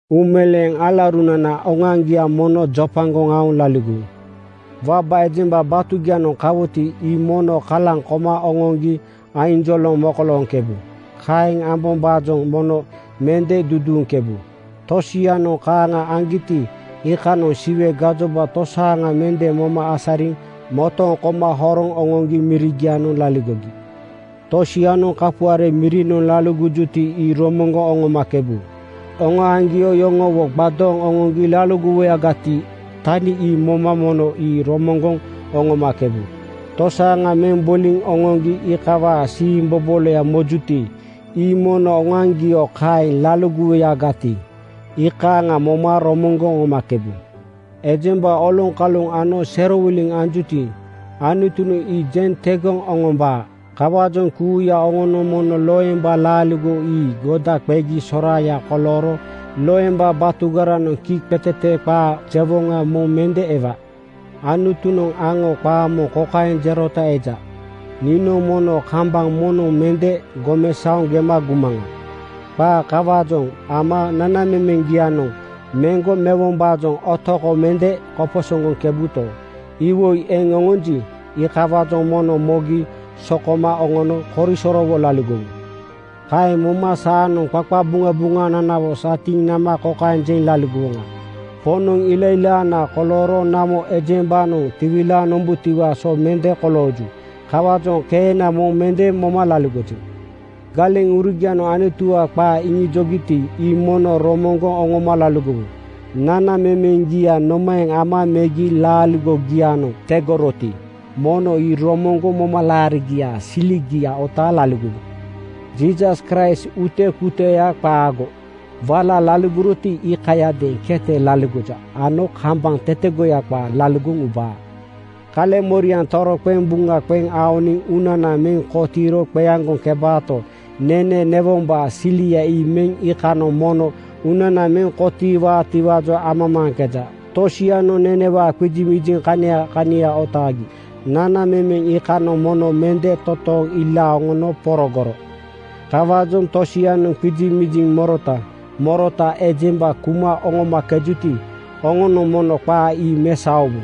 Uumeleeŋ alaurunana oŋoaŋgia mono jopagoŋ aoŋ laligowu. Waba ejemba batugianoŋ kawuti, ii mono kalaŋ koma oŋoŋgi ainjoloŋ mokolooŋkebu. Kaeŋ ambombaajoŋ mono mende duduuŋkebu. Tosianoŋ kaaŋa aŋgiti, iikanoŋ Siwe gajoba tosaaŋa mende moma asariŋ motooŋ koma horoŋ oŋoŋgi mirigianoŋ laligogi. Tosianoŋ kapuare mirinoŋ laligojuti, ii romoŋgoŋ oŋomakebu. Oŋoaŋgio yoŋowo gbadooŋ oŋoŋgi laligowuyagati, tani ii moma mono ii romoŋgoŋ oŋomakebu. Tosaaŋa meŋ boliŋ oŋoŋgi iikawaa siimboboloya mojuti, ii mono oŋoaŋgio kaeŋ laligowuyagati, iikaaŋa moma romoŋgoŋ oŋomakebu. Ejemba oloŋkalu ano serowiliŋ anjuti, Anutunoŋ ii jeŋ tegoŋ oŋombaa. Kawaajoŋ kuuya oŋonoŋ mono loemba laaligo ii goda qegi soraaya kolooro loemba batugaranoŋ kiiqetete qaa jewoŋa moŋ mende ewa. Anutunoŋ aŋo qaa moŋ kokaeŋ jerota eja, “Niinoŋ mono kambaŋ moŋnoŋ mende gomesaoŋ gema gumaŋa.” Qaa kawaajoŋ ama nanamemeŋgianoŋ meŋgo mewombaajoŋ otoko mende koposoŋgoŋkebuto, iwoi eŋ oŋonji, iikawaajoŋ mono mogi sokoma oŋono korisorowo laligowu. Kaeŋ moma saanoŋ qaqabuŋabuŋananawo satiiŋ nama kokaeŋ jeŋ laligowoŋa, “Poŋnoŋ ilailaana kolooro namo ejembanoŋ tiwilaaŋ nombutiwaa so mende kolooju. Kawaajoŋ keena moŋ mende moma laligojeŋ.” Galeŋurugianoŋ Anutuwaa qaa iŋijogiti, ii mono romoŋgoŋ oŋoma laligowu. Nanamemeŋgia nomaeŋ ama megi laaligogianoŋ tegoroti, mono ii romoŋgoŋ momalaarigiaa siligia otaaŋ laligowu. Jiisas Kraist utekuteya qaago. Wala laligoroti, iikayadeeŋ kete laligoja ano kambaŋ tetegoya qaa laligoŋ ubaa. Kaleŋmoriaŋ toroqeŋ buŋa qeŋ aoniŋ uunana meŋ kotiiro qeaŋgoŋkebaato, nene newombaa silia ii me iikanoŋ mono uunana meŋ kotiiwaatiwaajoŋ amamaaŋkeja. Tosianoŋ nenewaa qizimiziŋ kania kania otaagi nanamemeŋ iikanoŋ mono mende totooŋ ilaaŋ oŋono porogoro. Kawaajoŋ tosianoŋ qizimiziŋ morota morota ejemba kuma oŋomakejuti, oŋonoŋ mono qaa ii mesaowu.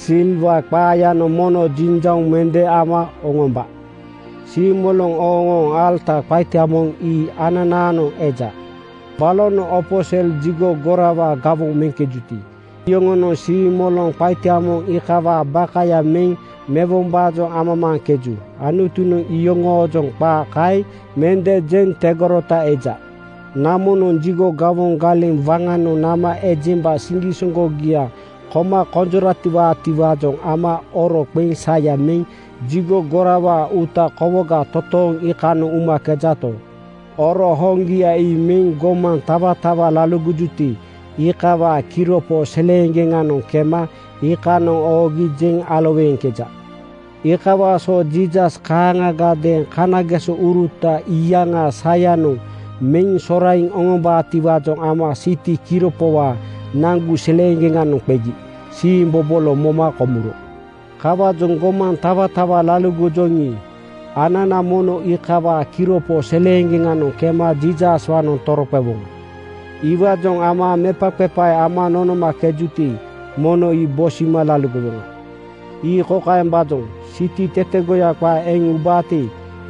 (Siliwaa qaayanoŋ mono jiŋjauŋ mende ama oŋomba.) Siimoloŋ ooŋooŋ alata qaita moŋ ii ananaanoŋ eja. Balonoŋ opo sel jigo gorawaa gawoŋ meŋkejuti, iyoŋonoŋ siimoloŋ qaita moŋ iikawaa bakaya meŋ newombaajoŋ amamaaŋkeju. Anutunoŋ iyoŋoojoŋ qaa kaeŋ mende jeŋ tegorota eja. Namonoŋ jigo gawoŋ galeŋ waŋanoŋ nama ejemba siŋgisoŋgogia koma konjoratiwaatiwaajoŋ ama oro qeŋ saya meŋ jigo gorawaa uuta kowoga totooŋ iikanoŋ umakejato, oro hoŋgia ii meŋ gomaŋ tawatawa laligojuti, iikawaa kiropo seleeŋgeŋanoŋ kema iikanoŋ oogi jeŋ aloweeŋkeja. Iikawaa so Jiisas kaaŋagadeeŋ kanagesouruta iyaŋaa sayanoŋ meŋ soraiŋ oŋombaatiwaajoŋ ama siti kiropowaa nagu seleeŋgeŋanoŋ qegi siimbobolo moma komuro. Kawaajoŋ gomaŋ tawatawa laligojoŋi, anana mono iikawaa kiropo seleeŋgeŋanoŋ kema Jiisaswaanoŋ toroqewoŋa. Iwaajoŋ ama mepaqepae ama nonomakejuti, mono ii bosima laligowoŋa. Ii kokaembaajoŋ: Siti tetegoya qaa eŋ ubaati,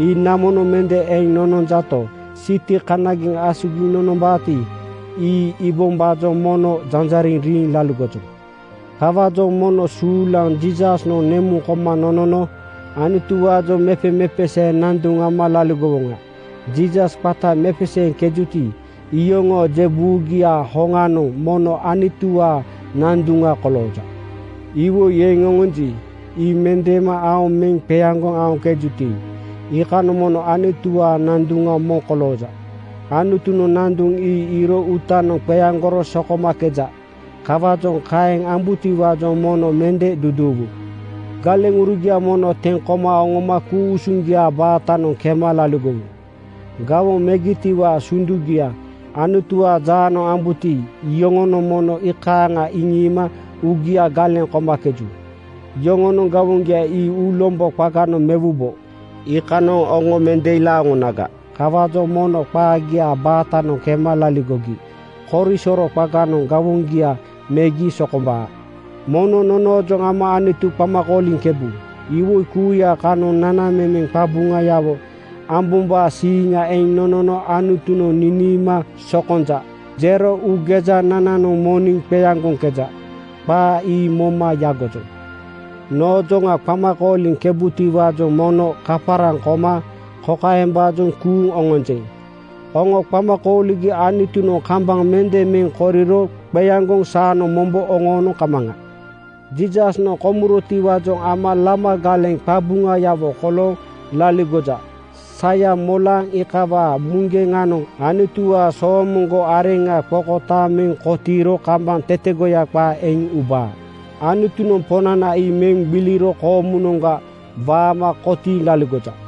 ii namonoŋ mende eŋ nononjato, siti kanageŋ asugiŋ nonombaati, ii iibombaajoŋ mono janjariŋ riiŋ laligojoŋ. Kawaajoŋ mono suulaŋ Jiisasnoŋ nemuŋ koma nonono Anutuwaajoŋ mepemepesee nanduŋ ama laligowoŋa. Jiisas qata mepeseeŋkejuti, iyoŋoo je buugiaa hoŋanoŋ mono Anutuwaa nanduŋa kolooja. Iwoi eŋ oŋonji, ii mendeema aoŋ meŋ qeaŋgoŋ aoŋkejuti, iikanoŋ mono Anutuwaa nanduŋa moŋ kolooja. Anutunoŋ nanduŋ ii iiro uutanoŋ qeaŋgoro sokomakeja. Kawaajoŋ kaeŋ ambutiwaajoŋ mono mende duduuwu. Galeŋurugia mono teŋ koma oŋoma ku-usuŋgia baatanoŋ kema laligowu. Gawoŋ megitiwaa sundugia Anutuwaa jaanoŋ ambuti, iyoŋonoŋ mono iikaaŋa iŋiima uugia galeŋ komakeju. Yoŋonoŋ gawoŋgia ii uulombo qaganoŋ mewubo. Iikanoŋ oŋo mende ilaaŋ oŋonaga. Kawaajoŋ mono qaagiaa baatanoŋ kema laligogi korisoro qaganoŋ gawoŋgia megi sokombaa. Mono nonoojoŋ ama Anutu qama kooliŋkebu. Iwoi kuuya kanoŋ nanamemeŋ qabuŋayawo ambombaa siiŋa eŋ nonono Anutunoŋ niniima “Sokonja,” jero uugejanananoŋ moniŋ qeaŋgoŋkeja. Qaa ii moma yagojoŋ. Noojoŋa qama kooliŋkebutiwaajoŋ mono kaparaŋ koma kokaembaajoŋ kuuŋ oŋonjeŋ: Oŋo qama kooligi Anutunoŋ kambaŋ mende meŋ koriro qeaŋgoŋ saanoŋ mombo oŋoonoŋ kamaŋa. Jiisasnoŋ komurotiwaajoŋ ama lama galeŋ qabuŋayawo kolooŋ laligoja. Saya molaaŋ iikawaa muŋgeŋanoŋ Anutuwaa soomoŋgo areŋa qokotaaŋ meŋ kotiiro kambaŋ tetegoya qaa eŋ ubaa. Anutunoŋ Poŋnana ii meŋ gbiliro koomunoŋga waama kotiiŋ laligoja.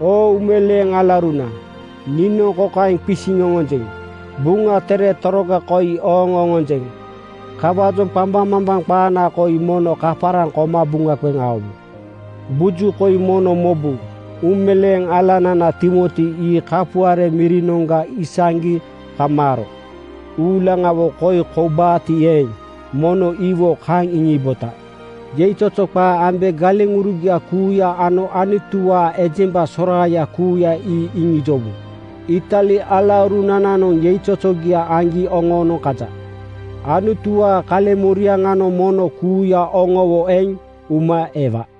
Oo uumeleeŋ alauruna, niinoŋ kokaeŋ qisiŋ oŋonjeŋ: Buŋa Tere toroga koi ooŋ oŋonjeŋ. Kawaajoŋ qambaŋmambaŋ qaana koi mono kaparaŋ koma buŋa qeŋ aowu. Buju koi mono mobu: Uumeleeŋ alanana Timoti ii kapuare mirinoŋga isaŋgi kamaaro. Uulaŋawo koi koubaati eeŋ, mono iwo kaŋ iŋiibota. Yeizozo qaa ambe galeŋurugia kuuya ano Anutuwaa ejemba soraaya kuuya ii iŋijowu. Itali alaurunananoŋ yeizozogia aŋgi oŋoonoŋ kaja. Anutuwaa kaleŋmoriaŋanoŋ mono kuuya oŋowo eŋ uma ewa.